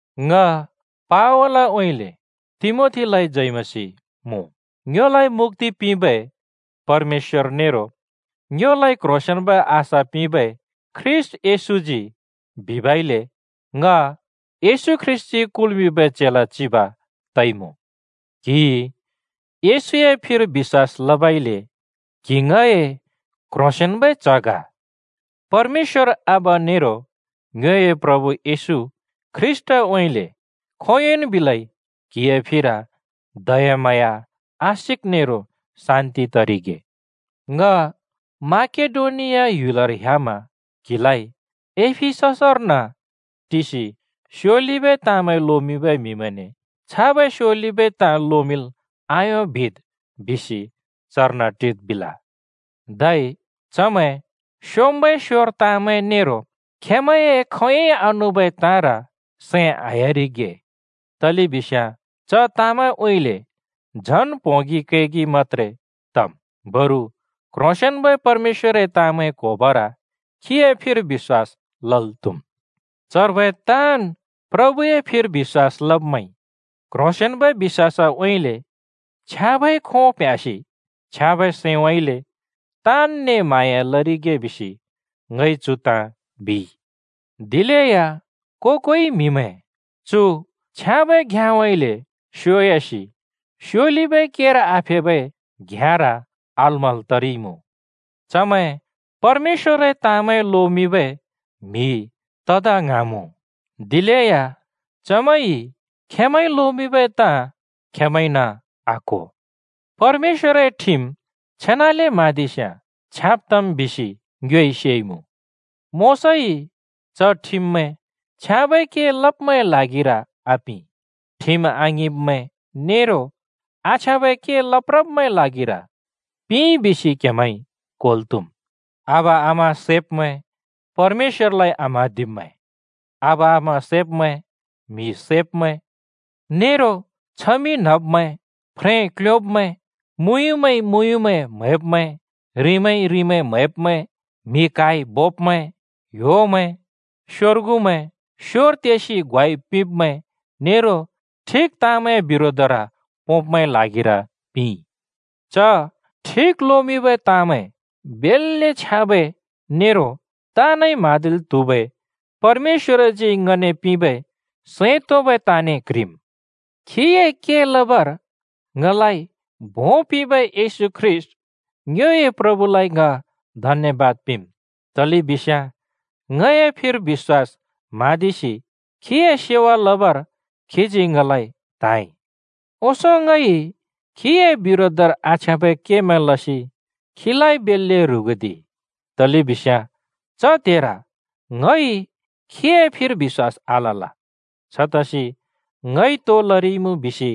ङ पावलउँइँले तिमोथीलाइ जय मसीह मुँ। ङ्योलाइ मुक्‍ति पिंबै परमेश्‍वर नेरो ङ्योलाइ क्ह्रोंसेंन्बै आशा पिंबै ख्रीष्‍ट येशूजी बिबइले ङ येशू ख्रीष्‍टजी कुल्मिंबै चेला चिब तइमुँ। क्हिइ येशूए फिर बिश्‍वास लबइले क्हि ङए क्ह्रोसेंन्बै च्ह ग। परमेश्‍वर आबा नेरो ङ्योए प्रभु येशू ख्रीष्‍टउँइँले खोंयोंन् बिलै क्हिए फिर दयाम्हाँया, आशिक नेरो शान्ति तरिगे। ङ माकेडोनिया ह्‍युलर ह्‍यामा क्हिलाइ “एफिससर्न टिसि स्योलिबै ताँमैं लोमिंबै म्हिमैंने छाबै स्योलिबै ताँ लोमिंल् आयों बिद्!” बिसि चर्न टिद् बिल। धै चमैं स्‍योंम्‍बै स्‍योर ताँमैं नेरो खेमैंए खोंयोंइ आनुबै ताँर सैं आह्‍यारिगे, तलेबिस्याँ च ताँमैंउँइँले झन प्होंगि कैगि मत्‍त्रे तम्। बरु क्ह्रोंसेंन्बै परमेश्‍वरए ताँमैं क्होबर खीए फिर बिश्‍वास लल् त्हुम्। चर्बै ताँन् प्रभुए फिर बिश्‍वास लब्मैंइ क्ह्रोंसेंन्बै बिश्‍वासउँइँले, छ्याँबै खों प्ह्‍यासि छ्याँबै सैंउँइँले, ताँनने म्हाँया लरिगे बिसि ङइ चु ताँ बिइ। दिलेया को-कोइ म्हिमैं चु छ्याँबै घ्‍याँउँइँले स्योयासि स्योलिबै केर आफेबै घ्‍याँर अलमल् तरिइमुँ। चमैं परमेश्‍वरए ताँमैं लोमिंबै म्‍हि तदा ङ्हाँमुँ, दिलेया चमैंइ खेंमैंइ लोमिंबै ताँ खेंमैंइन आक्‍हो। परमेश्‍वरए ठिम छेनाले म्हाँदिस्याँ छ्याँब तम् बिसि ङ्योइ सेइमुँ। मोशाइ च ठिममैं छ्याँबै के लब्‍मैंए ल्हागिर आपिं, ठिम आङिंब्मैं नेरो आछ्याँबै के लप्रब्मैंए ल्हागिर पिंइ बिसि क्हेमैंइ क्होल् त्हुम्। आबा आमा सैब्मैं, परमेश्‍वरलाइ आम्हाँदिब्मैं, आबा-आमा सैब्मैं, म्हि सैब्मैं, नेरो छमिं न्हब्मैं, फ्रें क्ल्योंब्मैं, मुँयुँमैंइ मुँयुँमैं म्हैब्मैं, रिंमैंइ रिंमैं म्हैब्मैं, म्हि क्हाइ बोब्मैं, ह्‍योमैं, स्योर्गुमैं, स्योर तेसि ग्वाइ पिंब्‍मैं नेरो ठिक ताँमैंए बिरोधर पोंब्मैंए ल्हागिर पिंइ। च ठिक लोमिंबै ताँमैं बेल्‍ले छ्याँबै नेरो ताँनइ म्हाँदिल् त्हुबै परमेश्‍वरजी ङने पिंबै सैं तोंबै ताँने क्ह्रिम्। खीए के लबर ङलाइ भों पिबै येशू ख्रीष्‍ट ङ्योए प्रभुलाइ ङ धन्‍यबाद पिंम्, तलेबिस्याँ ङए फिर बिश्‍वास म्हाँदिसि खीए सेवा लबर खीजी ङलाइ त्हाँइ। ओंसों ङइ खीए बिरोधर आछ्याँबै केमैं लसि खीलाइ बेल्‍ले ह्रुगुदिइ। तलेबिस्याँ च त्हेर ङइ खीए फिर बिश्‍वास आलल छतसि ङइ तो लरिइमुँ बिसि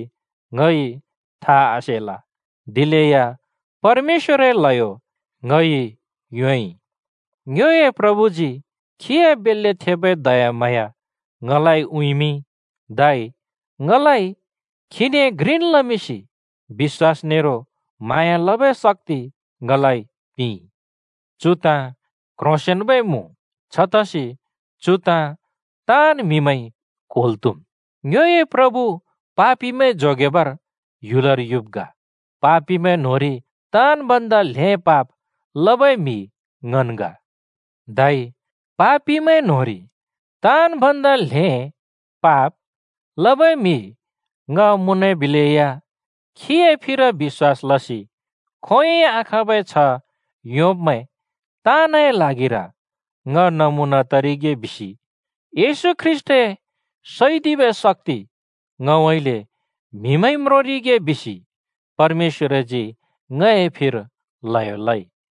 ङइ था आसेल, दिलेया परमेश्‍वरए ल्हयो ङइ योंइ। ङ्योए प्रभुजी खीए बेल्‍ले थेबै दयाम्हाँया ङलाइ उँइँमिंइ। धै ङलाइ खीने घ्रिन् लमिंसि बिश्‍वास नेरो म्हाँया लबै शक्‍ति ङलाइ पिंइ। चु ताँ क्ह्रोंसेंन्बै मुँ, छतसि चु ताँ ताँन् म्हिमैंइ क्वेंल् त्‍हुम्: ङ्योए प्रभु पापिमैं जोगेबर ह्‍युलर युब् ग। पापिमैं न्होंरि ताँन् भन्दा ल्हें पाप लबै म्हि ङन् ग। धै पापिमैं न्होंरि ताँन् भन्दा ल्हें पाप लबै म्‍हि ङ मुँनबिलेया खीए फिर बिश्‍वास लसि खोंयोंइ आखाँबै छ्ह योंब्‍मैं ताँनए ल्हागिर ङ नमुना तरिगे बिसि येशू ख्रीष्‍टए सैदिबै शक्‍ति ङउँइँले म्हिमैंइ म्रोंरिगे बिसि परमेश्‍वरजी ङए फिर ल्हयो लइ।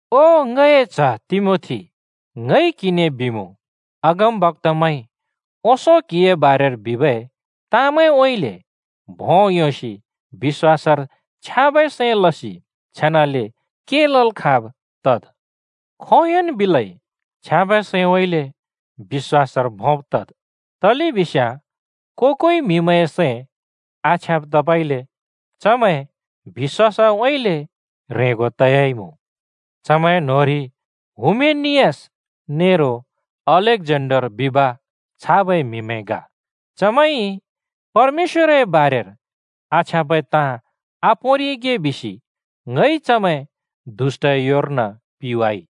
ओ ङए च्ह तिमोथी, ङइ क्‍हिने बिमुँ, अगमबक्‍तामैंइ ओंसों क्‍हिए बारेर बिबै तामैंउँइँले भों योंसि बिश्‍वासर छ्याँबै सैं लसि छेनाले के लल् खाँब् तद्। खोंयोंन् बिलै छ्याँबै सैंउँइँले बिश्‍वासर भोंब् तद्। तलेबिस्याँ को-कोइ म्हिमैंए सैं आछ्याँब तबइले चमैं बिश्‍वासउँइँले ह्रेंगो तयाइमुँ। चमैं न्होंरि हुमेनियस नेरो अलेक्जेन्डर बिब छाबै म्‍हिमैं ग। चमैंइ परमेश्‍वरए बारेर आछ्याँबै ताँ आपोंरिगे बिसि ङइ चमैं दुष्‍टए योर्न पिंवाइ।